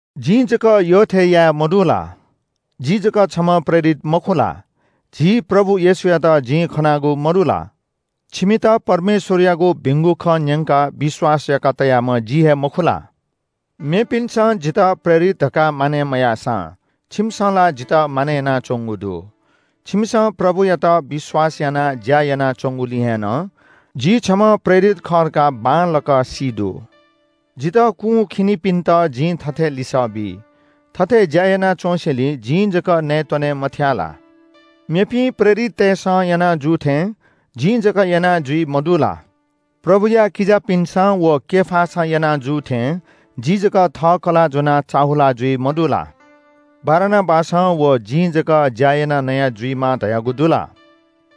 जिं जक यःथें याये मदु ला? जि जक छम्‍ह प्रेरित मखु ला? झी प्रभु येशूयात जिं खनागु मदु ला? छिमित परमेश्‍वरयागु भिंगु खँ न्‍यंकाः विश्‍वास याका तयाम्‍ह जि हे मखु ला? मेपिन्‍सं जितः प्रेरित धकाः मानय् मयाःसां छिमिसं ला जितः मानय् यानाच्‍वंगु दु। छिमिसं प्रभुयात विश्‍वास यानाः ज्‍या यानाच्‍वंगुलिं हे नं जि छम्‍ह प्रेरित खः धकाः बांलाक सी दु। जितः कुंखिनिपिन्‍त जिं थथे लिसः बी – थथे ज्‍या याना च्‍वँसेंलि जिं जक नयेत्‍वने मथ्‍याः ला? मेपिं प्रेरिततय्‌सं याना जू थें जिं जक याना जुइ मदु ला? प्रभुया किजापिन्‍सं व केफासं याना जू थें जि जक थः कलाः ज्‍वनाः चाःहुला जुइ मदु ला? बारनाबासं व जिं जक ज्‍या यानाः नया जुइमाः धयागु दु ला?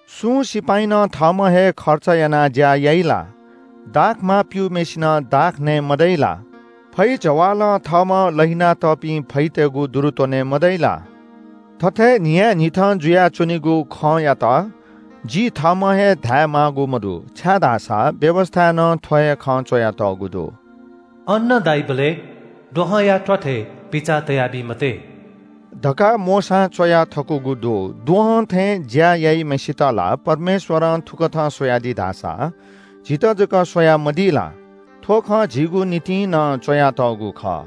सुं सिपाइँनं थःम्‍हं हे खर्च यानाः ज्‍या याइ ला? दाखमा प्‍यूम्‍हय्‌सिनं दाख नये मदइ ला? फैजवालं थःम्‍हं लहिनातःपिं फैतय्‌गु दुरु त्‍वने मदइ ला? थथे न्‍हियान्‍हिथं जुयाच्‍वनीगु खँयात जि थःम्‍हं हे धायेमाःगु मदु, छाय्‌धाःसा व्‍यवस्‍थाय् नं थ्‍व हे खँ च्‍वयातःगु दु। “अन्‍न दाइबलय् द्वहंया त्‍वाथय् पिचा तयाबी मते” धकाः मोशां च्‍वया थकूगु दु। द्वहं थें ज्‍याःम्‍हय्‌सित ला परमेश्‍वरं थुकथं स्‍वयादी धाःसा झीत जक स्‍वयामदी ला? थ्‍व खँ झीगु निंतिं नं च्‍वयातःगु खः।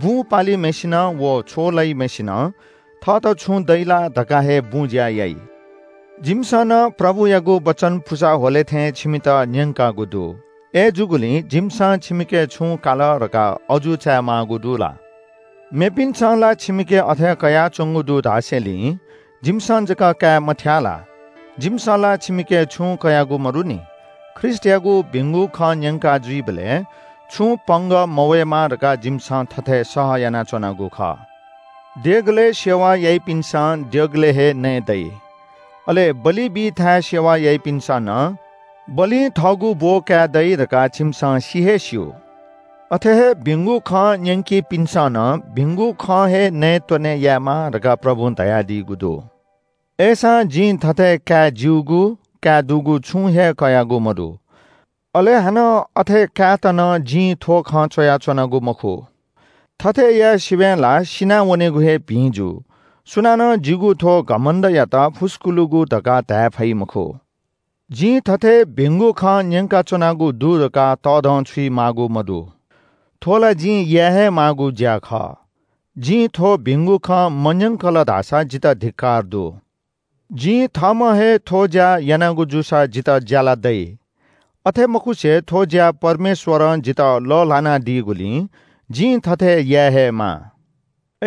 बुँ पालिम्‍हय्‌सिनं व छ्व लइम्‍हय्‌सिनं थःत छुं दइ ला धकाः हे बुँज्‍या याइ। जिमिसं नं प्रभुयागु वचन पुसा ह्वले थें छिमित न्‍यंकागु दु। अय्‌जूगुलिं जिमिसं छिमिके छुं काल धकाः अजू चायेमाःगु दु ला? मेपिन्‍सं ला छिमिके अथे कयाच्‍वंगु दु धासेंलि जिमिसं जक काये मथ्‍याः ला? जिमिसं ला छिमिके छुं कयागु मदुनि। ख्रीष्‍टयागु भिंगु खँ न्‍यंका जुइबलय् छुं पंगः मवय्‌मा धकाः जिमिसं थथे सह यानाच्‍वनागु खः। देगलय् सेवा याइपिन्‍सं देगलय् हे नयेदइ, अले बलि बी थाय् सेवा याइपिन्‍सं नं बलिं थःगु ब्‍ब काये दइ धकाः छिमिसं सि हे स्‍यू। अथे हे भिंगु खँ न्‍यंकीपिन्‍सं नं भिंगु खं हे नयेत्‍वने यायेमाः धकाः प्रभुं धयादीगु दु। अय्‌सां जिं थथे काये ज्‍यूगु, काये दुगु छुं हे कयागु मदु। अले हानं अथे कायेत नं जिं थ्‍व खँ च्‍वयाच्‍वनागु मखु। थथे याये सिबें ला सिनावनेगु हे भिं जू। सुनानं जिगु थ्‍व घमण्‍डयात फुस्‍कुलुगु धकाः धाये फइ मखु। जिं थथे भिंगु खँ न्‍यंकाच्‍वनागु दु धकाः तःधंछुइ माःगु मदु। थ्‍व ला जिं याये हे माःगु ज्‍या खः। जिं थ्‍व भिंगु खँ मन्‍यंकल धाःसा जितः धिक्‍कार दु। जिं थःम्‍हं हे थ्‍व ज्‍या यानागु जूसा जितः ज्‍याला दइ। अथे मखुसे थ्‍व ज्‍या परमेश्‍वरं जितः लः ल्‍हानादीगुलिं जिं थथे याये हे माः।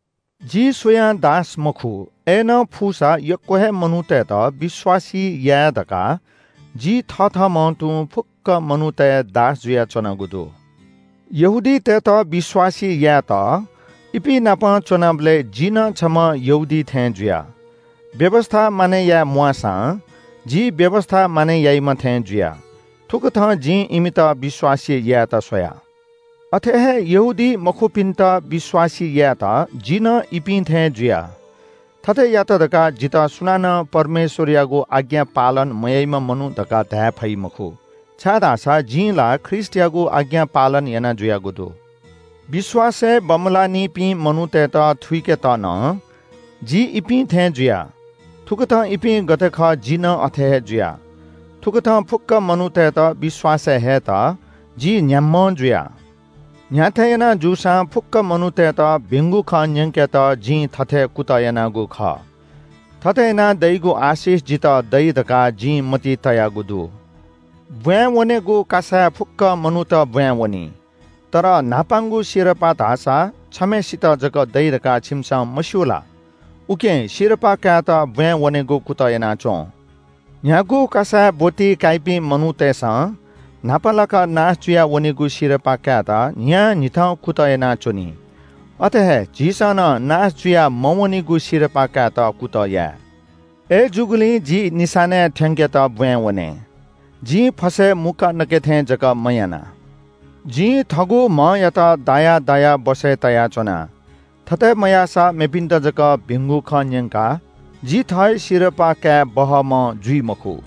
जि सुयां दास मखु। अय्‌नं फुसा यक्‍व हे मनूतय्‌त विश्‍वासी याये धकाः जि थथःम्‍हं तुं फुक्‍क मनूतय् दास जुयाच्‍वनागु दु। यहूदीतय्‌त विश्‍वासी यायेत इपिं नाप च्‍वनाबलय् जि नं छम्‍ह यहूदी थें जुया। व्‍यवस्‍था मानय् याये म्‍वाःसां जि व्‍यवस्‍था मानय् याइम्‍ह थें जुया। थुकथं जिं इमित विश्‍वासी यायेत स्‍वया। अथे हे यहूदीमखुपिन्‍त विश्‍वासी यायेत जि नं इपिं थें जुया। थथे यात धकाः जितः सुनानं परमेश्‍वरयागु आज्ञा पालन मयाइम्‍ह मनू धकाः धाये फइ मखु, छाय्‌धाःसा जिं ला ख्रीष्‍टयागु आज्ञा पालन याना जुयागु दु। विश्‍वासय् बमलानिपिं मनूतय्‌त थुइकेत नं जि इपिं थें जुया। थुकथं इपिं गथे खः जि नं अथे हे जुया। थुकथं फुक्‍क मनूतय्‌त विश्‍वासय् हयेत जि न्‍ह्याम्‍हं जुया। न्‍ह्याथे यानाः जूसां फुक्‍क मनूतय्‌त भिंगु खँ न्‍यंकेत जिं थथे कुतः यानागु खः। थथे यानाः दइगु आशिष जितः दइ धकाः जिं मतिइ तयागु दु। ब्‍वाँय् वनेगु कासाय् फुक्‍क मनूत ब्‍वाँय् वनी, तर न्‍हापांगु सिरपाः धाःसा छम्‍हय्‌सित जक दइ धकाः छिमिसं मस्‍यू ला? उकिं सिरपाः कायेत ब्‍वाँय् वनेगु कुतः याना च्‍वँ। न्‍ह्यागु कासाय् ब्‍वति काइपिं मनूतय्‌सं न्‍हापा लाकाः नाश जुया वनीगु सिरपाः कायेत न्‍हियान्‍हिथं कुतः यानाच्‍वनी। अथे हे झीसं नं नाश जुया मवनीगु सिरपाः कायेत कुतः याये। अय्‌जूगुलिं जि निशानाय् थ्‍यंकेत ब्‍वाँय् वने। जिं फसय् मुक्‍का नके थें जक मयाना। जिं थःगु म्‍हयात दायाः दायाः बसय् तयाच्‍वना। थथे मयाःसा मेपिन्‍त जक भिंगु खँ न्‍यंकाः जि थः हे सिरपाः काये बहःम्‍ह जुइ मखु।